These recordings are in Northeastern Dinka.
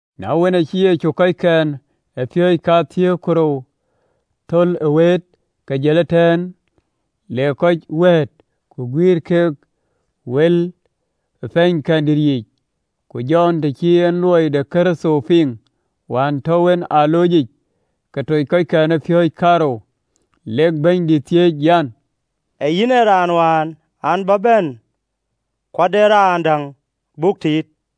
Na wën, acï Yecu kɔckɛn ë piööcë kathiëër ku rou thöl ë wëët, ke jël ëtɛ̈ɛ̈n le kɔc wɛ̈ɛ̈t ku guïïr keek wël ë pɛ̈ɛ̈nykɛndït yiic. Ku Jɔn, të cï en luɔi de Kërtho piŋ wään tɔ̈u en ë aloocic, ke toc kɔckɛn ë piööcë kaarou, Lek Bɛ̈nydït thiëëc an, “Ee yïn ë raan wään an, bä bɛ̈n, ku de raan däŋ buk tiit?”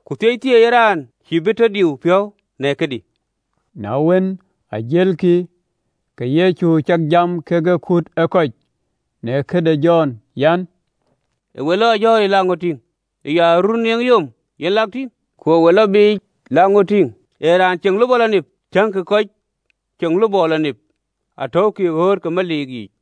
Ku thieithieei ë raan cïï bï tɔ diu piɔ̈u në këdï.” Na wën, jëlkï, ke Yecu cak jam kekë kut ë kɔc në këde Jɔn an, “Ë we lɔ ë jɔ̈ɔ̈ric lak ŋö tïŋ? Ee aruöör nieŋë yom, yen ë lak tïŋ? Ku ë we lɔ biic lak ŋö tïŋ? Ee raan ceŋ lupɔ lɔ nip? Tiëŋkï, kɔc ceŋ lupɔ lɔ nip atɔ̈ukï ë ɣööt ke meliik yiic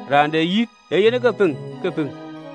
Raan de yith ee yen ke piŋ, ke piŋ.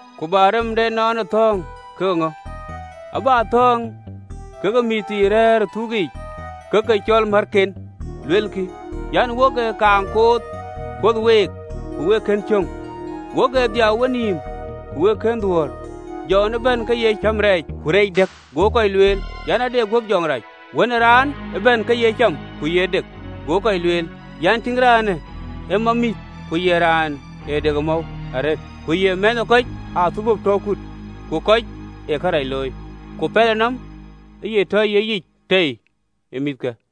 Ku bä rem de ënɔɔnë thɔ̈ɔ̈ŋ ke ŋö? Abä thɔ̈ɔ̈ŋ ke mïththii rɛ̈ɛ̈r ë thuk yiic, ke ke cɔl määthken, luelkï an, “Wok ë kaaŋ kuöth week, ku wek kën cöŋ, ku wok ë dhiau ë wenïïm, ku wek kën dhuöör. Jɔn ë bɛ̈n ke ye cäm rɛɛc ku reec dëk, go kɔc lueel an, “Ade guöp jɔŋ rac.” Wën ë Raan ë bɛ̈n ke ye cam ku ye dek, go kɔc lueel an, “Tïŋ raanë, ee mamïth ku ye raan ë dek ë mɔ̈u arëët, ku ye mɛ̈thë ë kɔc ë athölbö tɔ kut ku kɔc ë kërac looi! Ku Pɛlënɔm aye tɔ ye yic tei në mïthke.”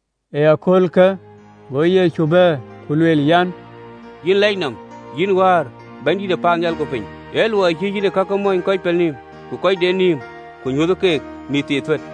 Ë aköölkë go Yecu bɛ̈ɛ̈r ku lueel an, “Yïn lɛc nɔm, yïn Wäär, Bɛ̈nydït ë paannhial ku piny, ë luɔi cï yïn kakë mɔ̈ny kɔc pelnïïm, ku kɔc de nïïm, ku nyuöthë ke mïththii thuët.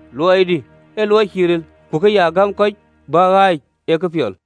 Luɔidï ee luɔi cïï ril, ku ke ya gäm kɔc bïk ɣääc ee këpiɔl.”